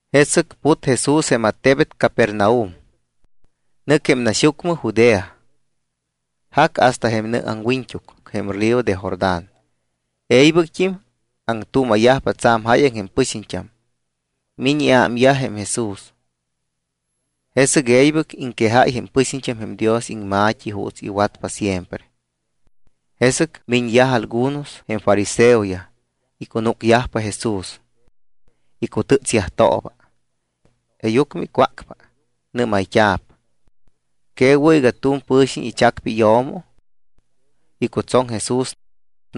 Jesɨc put Jesús jém attebet Capernaum. Nɨc jém naxyucmɨ Judea. Jac hasta jém nɨ aŋwiñt́uc jém río de Jordán. E̱ybɨct́im aŋtuuma̱yajpa tsa̱m jáyaŋ jém pɨxiñt́am. Miñ iámyaj jém Jesús. Jesɨc e̱ybɨc iŋquejáy jém pɨxiñt́am jém Dios iŋma̱t́i juuts iwatpa siempre. Jesɨc miñyaj algunos jém fariseoyaj, icunúcyajpa Jesús. Icutɨ́tsyajtooba. Jeeyucmɨ icwácpa, nɨ́mayt́a̱p: —¿Que wɨ̱ iga tu̱m pɨ̱xiñ ichacpa iyo̱mo? Icutsoŋ Jesús.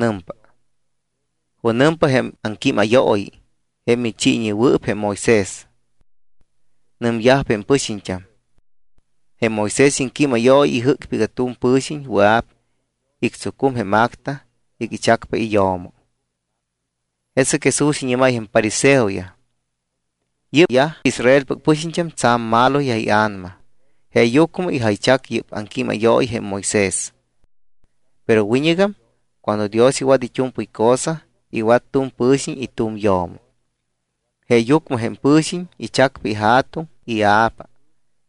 Nɨmpa: —¿Junɨmpa jém aŋquímayooyi jém michiiñewɨɨp jém Moisés? Nɨmyajpa jém pɨxiñt́am: —Jém Moisés iŋquímayooyi ijɨ́cpa iga tu̱m pɨ̱xiñ wɨa̱p ictsucum tu̱m acta iga ichacpa iyo̱mo. Jesɨc Jesús iñɨ́máy jém fariseoyaj: —Yɨ́pyaj Israelpɨc pɨxiñt́am tsa̱m maloyaj ia̱nama jeeyucmɨ ijaychac yɨ́p aŋquímayooyi jém Moisés. Pero wiñɨgam cuando Dios iwat it́u̱mpɨy cosa, iwat tu̱m pɨ̱xiñ y tu̱m iyo̱mo. Jeeyucmɨ jém pɨ̱xiñ ichacpa ija̱tuŋ y ia̱pa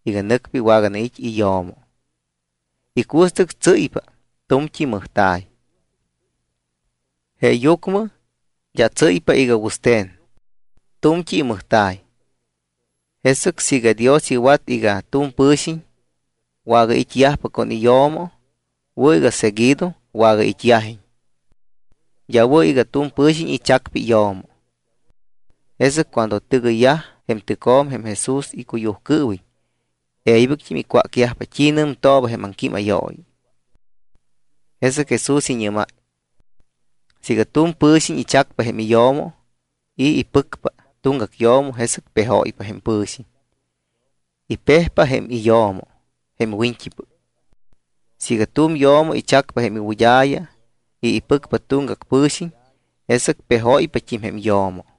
iga nɨcpa iwaganait́ iyo̱mo. Icuɨstɨc tsɨ́ypa tu̱mt́i mɨjta̱y. Jeeyucmɨ d́a tsɨ́ypa iga wɨste̱n. Tu̱mt́i imɨjta̱y. Jesɨc siiga Dios iwat iga tu̱m pɨ̱xiñ wagait́yajpa con iyo̱mo, wɨ̱ iga seguido wagait́yajiñ. D́a wɨ̱ iga tu̱m pɨ̱xiñ ichacpa iyo̱mo. Jesɨc cuando tɨgɨyyaj jém tɨcjo̱m jém Jesús icuyujcɨɨwiñ, e̱ybɨct́im icwácyajpa t́i nɨmtooba jém aŋquímayooyi. Jesɨc Jesús iñɨ́máy: —Siiga tu̱m pɨ̱xiñ ichacpa jém iyo̱mo y ipɨcpa tuŋgac yo̱mo, jesɨc pejóypa jém pɨ̱xiñ. Ipejpa jém iyo̱mo jém wiñt́ipɨc. Siiga tu̱m yo̱mo ichacpa jém iwɨd́a̱ya y ipɨcpa tuŋgac pɨ̱xiñ, jesɨc pejóypat́im jém yo̱mo.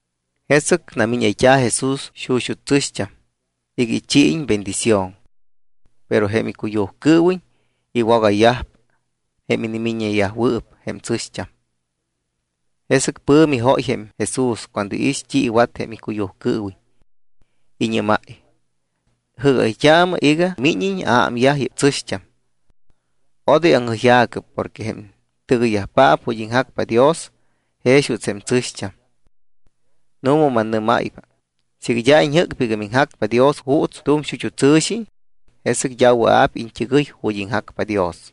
Jesɨc namíñayt́a̱ Jesús xuxut́ tsɨ̱xt́am iga ichiiñ bendición. Pero jém icuyujcɨɨwiñ iwogayyaj jém inimiññeyajwɨɨp jém tsɨ̱xt́am. Jesɨc pɨ̱mi jóy jém Jesús cuando iix t́i iwat jém icuyujcɨɨwiñ. Iñɨ́máy: —Jɨ́gayt́aamɨ iga míñiñ aámyaj yɨ́p tsɨ̱xt́am. Odoy aŋjɨyja̱cɨ porque jém tɨgɨyyajpaap ju̱t́ iŋjacpa Dios jex juuts jém tsɨ̱xt́am. Nu̱ma mannɨ́máypa siiga d́a iñjɨ́cpa iga miŋjacpa Dios juuts tu̱m xut́u tsɨ̱xi, jesɨc d́a wɨa̱p iñt́ɨgɨy ju̱t́ iŋjacpa Dios.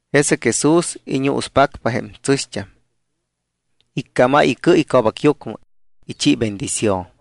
Jesɨc Jesús iñuuspacpa jém tsɨ̱xt́am. Iccámáy icɨ ico̱bacyucmɨ, ichi bendición.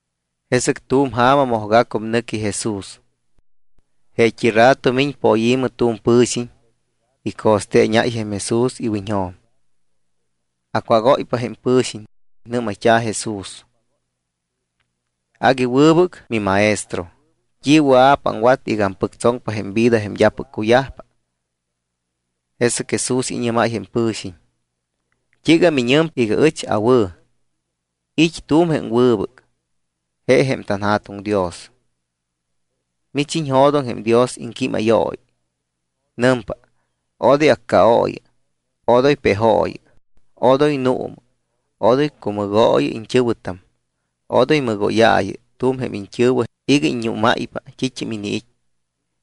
Jesɨc tu̱m ja̱ma mojgacum nɨqui Jesús. Jeet́i rato miñ poyi̱mɨ tu̱m pɨ̱xiñ, ico̱steeñáy jém Jesús iwiñjo̱m. Acwágóypa jém pɨ̱xiñ. Nɨ́mayt́a̱ Jesús: —Agui wɨbɨc miMaestro, ¿t́i wɨa̱p aŋwat iga ampɨctsoŋpa jém vida jém d́apɨc cuyajpa? Jesɨc Jesús iñɨ́máy jém pɨ̱xiñ: —¿T́iiga miñɨmpa iga ɨch awɨ̱? It́ tu̱m jém wɨbɨc, je jém tanJa̱tuŋ Dios. Mich iñjo̱doŋ jém Dios iŋquímayooyi. Nɨmpa: “Odoy accaooyɨ, odoy pejooyɨ, odoy nuumɨ, odoy cumɨgooyɨ iñt́ɨ̱wɨtam, odoy mɨgóyaayɨ tu̱m jém iñt́ɨ̱wɨ iga iññúmáypa t́it́am iniit́,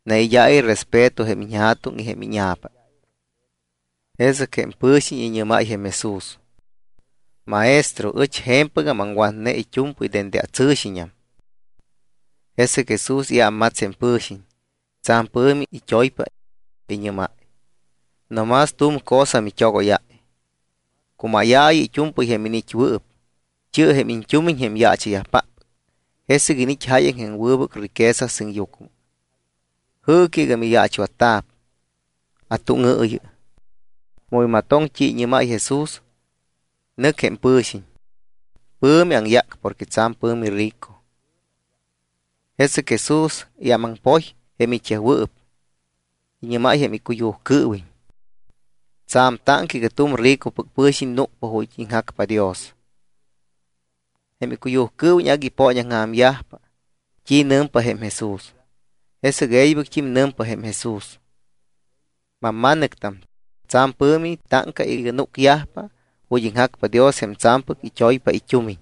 naid́aayɨ respeto jém iñja̱tuŋ y jém íña̱pa.” Jesɨc jém pɨ̱xiñ iñɨ́máy jém Jesús: —Maestro, ɨch je̱mpɨgam aŋwatne it́u̱mpɨy dende atsɨ̱xiñam. Jesɨc Jesús iámmats jém pɨ̱xiñ, tsa̱m pɨ̱mi it́oypa. Iñɨ́máy: —No más tu̱m cosa mit́ogóyáy. Cumáyaayɨ it́u̱mpɨy jém iniit́wɨɨp, chi̱ɨ jém tumiñ jém yaacha̱yajpáppɨc, jesɨc iniit́ jáyaŋ jém wɨbɨc riqueza sɨŋyucmɨ. Jɨɨcɨ iga miyaachwatta̱p, atúŋɨɨyɨ. Mu imatoŋ t́i iñɨ́máy jém Jesús, nɨc jém pɨ̱xiñ. Pɨ̱mi aŋyác porque tsa̱m pɨ̱mi rico. Jesɨc Jesús iámaŋpoy jém it́yajwɨɨp, iñɨ́máy jém icuyujcɨɨwiñ: —Tsa̱m táŋca iga tu̱m ricopɨc pɨ̱xiñ núcpa ju̱t́ iŋjacpa Dios. Jém icuyujcɨɨwiñ agui ipooñaŋja̱myajpa t́i nɨmpa jém Jesús. Jesɨc e̱ybɨct́im nɨmpa jém Jesús: —Mamma̱nɨctam, tsa̱m pɨ̱mi táŋca iga núcyajpa ju̱t́ iŋjacpa Dios jém tsa̱mpɨc it́oypa it́umiñ.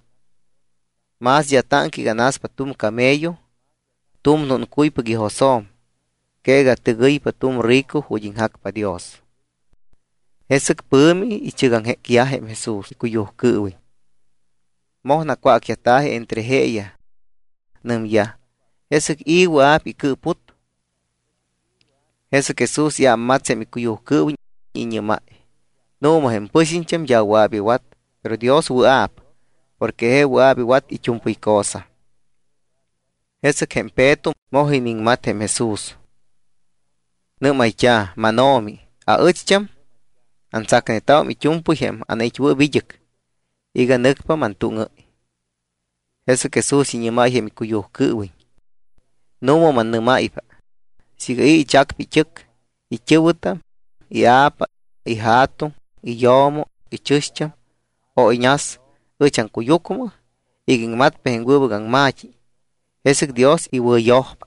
Más d́a táŋca iga naspa tu̱m camello tu̱m núncuypac ijosjo̱m que iga tɨgɨypa tu̱m rico ju̱t́ iŋjacpa Dios. Jesɨc pɨ̱mi ichɨgaŋjécyaj jém Jesús icuyujcɨɨwiñ. Moj nacwácyajta̱ji entre jeeyaj. Nɨmyaj: —¿Jesɨc i̱ wɨa̱p icɨɨput? Jesɨc Jesús iámmats jém icuyujcɨɨwiñ, iñɨ́máy: —Nu̱ma, jém pɨxiñt́am d́a wɨa̱p iwat, pero Dios wɨa̱p porque je wɨa̱p iwat it́u̱mpɨy cosa. Jesɨc jém Peto moj iniŋmat Jesús. Nɨ́mayt́a̱: —MánO̱mi, aɨcht́am antsacnetámum it́u̱mpɨy jém anait́wɨɨp id́ɨc iga nɨcpa mantúŋɨ́y. Jesɨc Jesús iñɨ́máy jém icuyujcɨɨwiñ: —Nu̱ma mannɨ́máypa, siiga i̱ ichacpa it́ɨc, it́ɨ̱wɨtam, ia̱pa, ija̱tuŋ, iyo̱mo, ichɨ̱xt́am, o iñas ɨch aŋcuyucmɨ iga iŋmatpa jém wɨbɨc aŋma̱t́i, jesɨc Dios iwɨ̱yojpa.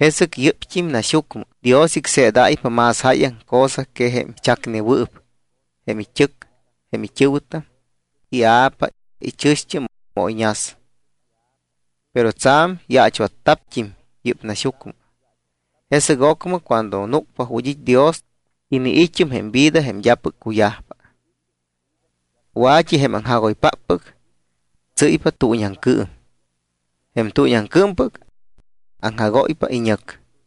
Jesɨc yɨ́pt́im naxyucmɨ Dios icseedáypa más jáyaŋ cosa que jém ichacneyajwɨɨp jém it́ɨc, it́ɨ̱wɨtam, ia̱pa, ichɨ̱xt́am, o iñas. Pero tsa̱m yaachwatta̱pt́im yɨ́p naxyucmɨ. Jesɨc ocmɨ cuando núcpa ju̱t́ it́ Dios, iniit́um jém vida jém d́apɨc cuyajpa. Wa̱t́i jém aŋjagoypáppɨc tsɨ́ypa tuuñiaŋcɨɨm, jém tuuñiaŋcɨɨmpɨc, aŋjagóypa iñɨc.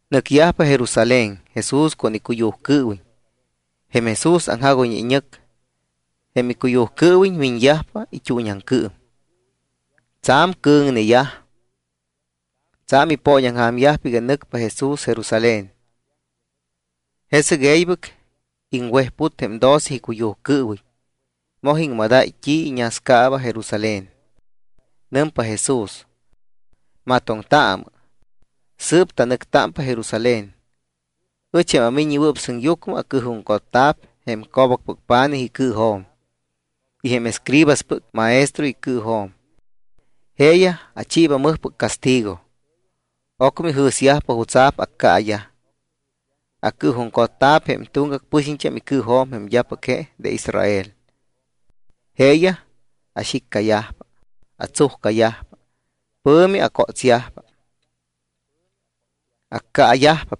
Nɨcyajpa Jerusalén Jesús con icuyujcɨɨwiñ. Jém Jesús aŋjagoyñe iñɨc, jém icuyujcɨɨwiñ miñyajpa it́uuñiaŋcɨɨm. Tsa̱m cɨ̱ŋneyaj. Tsa̱m ipooñaŋja̱myajpa iga nɨcpa Jesús Jerusalén. Jesɨc e̱ybɨc iŋwejput jém doce icuyujcɨɨwiñ, moj iŋmadáy t́it́am iñascaaba Jerusalén. Nɨmpa Jesús: —Matoŋtaamɨ. Sɨɨp tanɨctámpa Jerusalén. Ɨch jém aMiññewɨɨp Sɨŋyucmɨ acɨɨjuŋcotta̱p jém co̱bacpɨc pa̱nij icɨɨjo̱m y jém escribaspɨc maestroyaj icɨɨjo̱m. Jeeyaj achiiba mɨjpɨc castigo. Ocmɨ ijɨ̱syajpa jutsa̱p accaayaj. Acɨɨjuŋcotta̱p jém tuŋgac pɨxiñt́am icɨɨjo̱m jém d́apɨc je de Israel. Jeeyaj axiccayajpa, atsujcayajpa, pɨ̱mi acótsyajpa. Accaayajpa.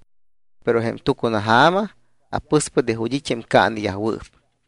Pero jém tucunaja̱ma apɨspa de ju̱t́ it́ jém caaneyajwɨɨp.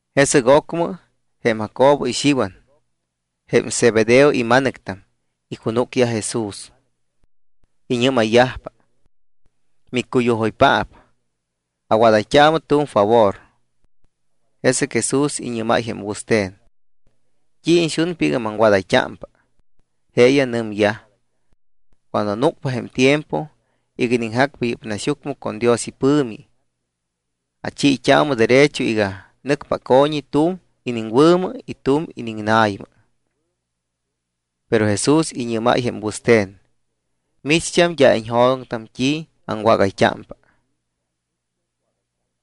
Jesɨc ocmɨ jém Jacobo y jém Xiwan, jém Zebedeo ima̱nɨctam, icunúcyaj Jesús. Iñɨ́mayyajpa: —Miccuyujoypaap, awadayt́aamɨ tu̱m favor. Jesɨc Jesús iñɨ́máy jém wɨste̱n: —¿T́i iñxunpa iga maŋwadayt́ámpa? Jeeyaj nɨmyaj: —Cuando núcpa jém tiempo iga iniŋjacpa yɨ́p naxyucmɨ con Dios ipɨ̱mi, achiit́aamɨ derecho iga nɨcpa aco̱ñi tu̱m iniŋwɨ̱mɨ y tu̱m iniŋna̱ymɨ. Pero Jesús iñɨ́máy jém wɨste̱n: —Micht́am d́a iñjo̱doŋtam t́i aŋwágayt́ámpa.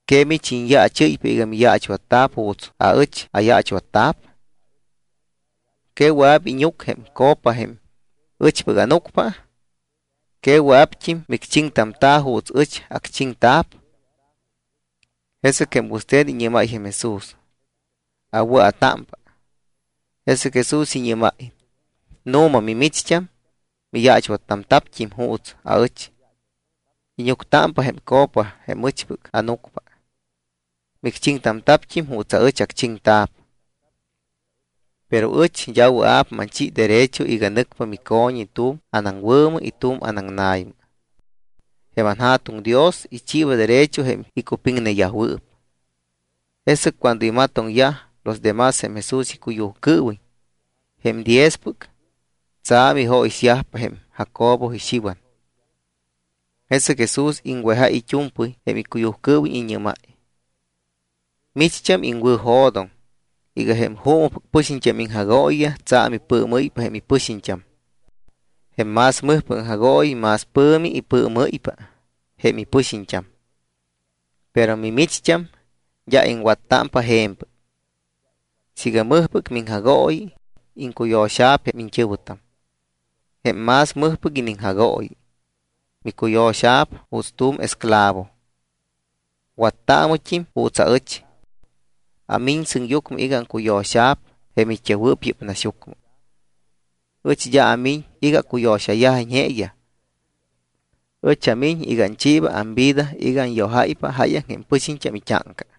¿Que mich iñyaachɨ́ypa iga miyaachwatta̱p juuts aɨch ayaachwatta̱p? ¿Que wɨa̱p íñuc jém copa jém ɨchpɨc ánucpa? ¿Que wɨa̱pt́im micchiŋtamta̱ juuts ɨch acchiŋta̱p? Jesɨc jém wɨste̱n iñɨ́máy jém Jesús: —Awɨa̱támpa. Jesɨc Jesús iñɨ́máy: —Nu̱ma, mimicht́am miyaachwattamta̱pt́im juuts aɨch. Íñuctámpa jém copa jém ɨchpɨc ánucpa. Micchiŋtamta̱pt́im juuts aɨch acchiŋta̱p. Pero ɨch d́a wɨa̱p manchi derecho iga nɨcpa mico̱ñi tu̱m anaŋwɨ̱mɨ y tu̱m anaŋna̱ymɨ. Jém anJa̱tuŋ Dios ichiiba derecho jém icupiŋneyajwɨɨp. Jesɨc cuando imatoŋyaj los de más jém Jesús icuyujcɨɨwiñ, jém diezpɨc, tsa̱m ijóyixyajpa jém Jacobo y Xiwan. Jesɨc Jesús iŋwejáy it́u̱mpɨy jém icuyujcɨɨwiñ. Iñɨ́máy: —Micht́am iŋwɨ̱jo̱doŋ iga jém juumɨpɨc pɨxiñt́am iŋjagooyiyaj tsa̱m ipɨɨmɨ́ypa jém ipɨxiñt́am. Jém más mɨjpɨc aŋjagooyi más pɨ̱mi ipɨɨmɨ́ypa jém ipɨxiñt́am. Pero mimicht́am d́a iŋwattámpa je̱mpɨc. Siiga mɨjpɨc miŋjagooyi, iŋcuyo̱xa̱p jém iñt́ɨ̱wɨtam. Jém más mɨjpɨc iniŋjagooyi micuyo̱xa̱p juuts tu̱m esclavo. Wattaamɨt́im juuts aɨch. Amiñ sɨŋyucmɨ iga aŋcuyo̱xa̱p jém it́yajwɨɨp yɨ́p naxyucmɨ. Ɨch d́a amiñ iga acuyo̱xayajiñ jeeyaj. Ɨch amiñ iga anchiiba amvida iga anyojáypa jáyaŋ jém pɨxiñt́am it́áŋca.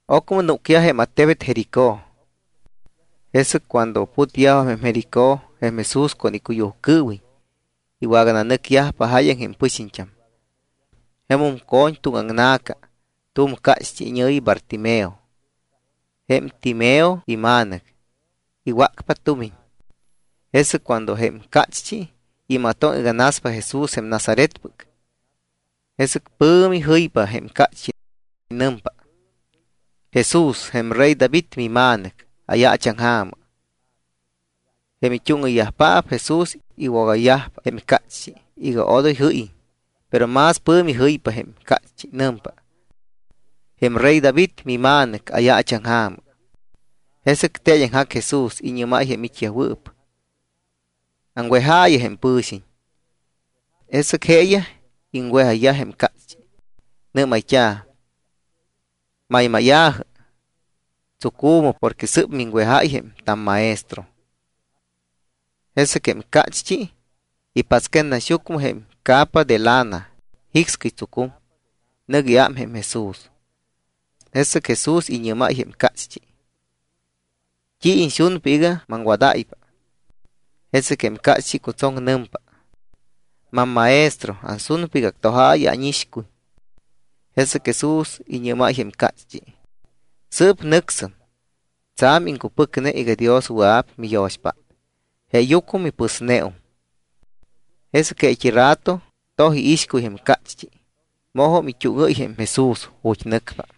Ocmɨ núcyaj jém attebet Jericó. Jesɨc cuando putyajpa jém Jericó jém Jesús con icuyujcɨɨwiñ iwagananɨcyajpa jáyaŋ jém pɨxiñt́am. Jemum co̱ñ tuŋaŋna̱ca tu̱m cácht́i iñɨ̱yi Bartimeo jém Timeo ima̱nɨc. Iwácpa tumiñ. Jesɨc cuando jém cácht́i imatoŋ iga naspa Jesús jém Nazaretpɨc, jesɨc pɨ̱mi jɨypa jém cácht́i. Nɨmpa: —Jesús, jém rey David mima̱nɨc, ayaachaŋja̱mɨ. Jém it́úŋɨyyajpaap Jesús iwogayyajpa jém cácht́i iga odoy jɨ́yiñ. Pero más pɨ̱mi jɨypa jém cácht́i. Nɨmpa: —Jém rey David mima̱nɨc, ayaachaŋja̱mɨ. Jesɨc teeñaŋjac Jesús. Iñɨ́máy jém it́yajwɨɨp: —Aŋwejaayɨ jém pɨ̱xiñ. Jesɨc jeeyaj iŋwejayyaj jém cácht́i. Nɨ́mayt́a̱: —Maymáya̱jɨ. Tsucu̱mɨ, porque sɨ́p miŋwejáy jém tamMaestro. Jesɨc jém cácht́i ipatsquet naxyucmɨ jém icapa de lana, jicscɨy tsucum, nɨc iám jém Jesús. Jesɨc Jesús iñɨ́máy jém cácht́i: —¿T́i iñxunpa iga maŋwadáypa? Jesɨc jém cácht́i icutsoŋ. Nɨmpa: —MamMaestro, ansunpa iga actojaayɨ ánixcuy. Jesɨc Jesús iñɨ́máy jém cácht́i: —Sɨɨp nɨcsɨm. Tsa̱m iŋcupɨcne iga Dios wɨa̱p miyo̱xpát, jeeyucmɨ mipɨsneum. Jesɨc jeet́i rato toj iixcuy jém cácht́i, mojum it́úŋɨ́y jém Jesús ju̱t́ nɨcpa.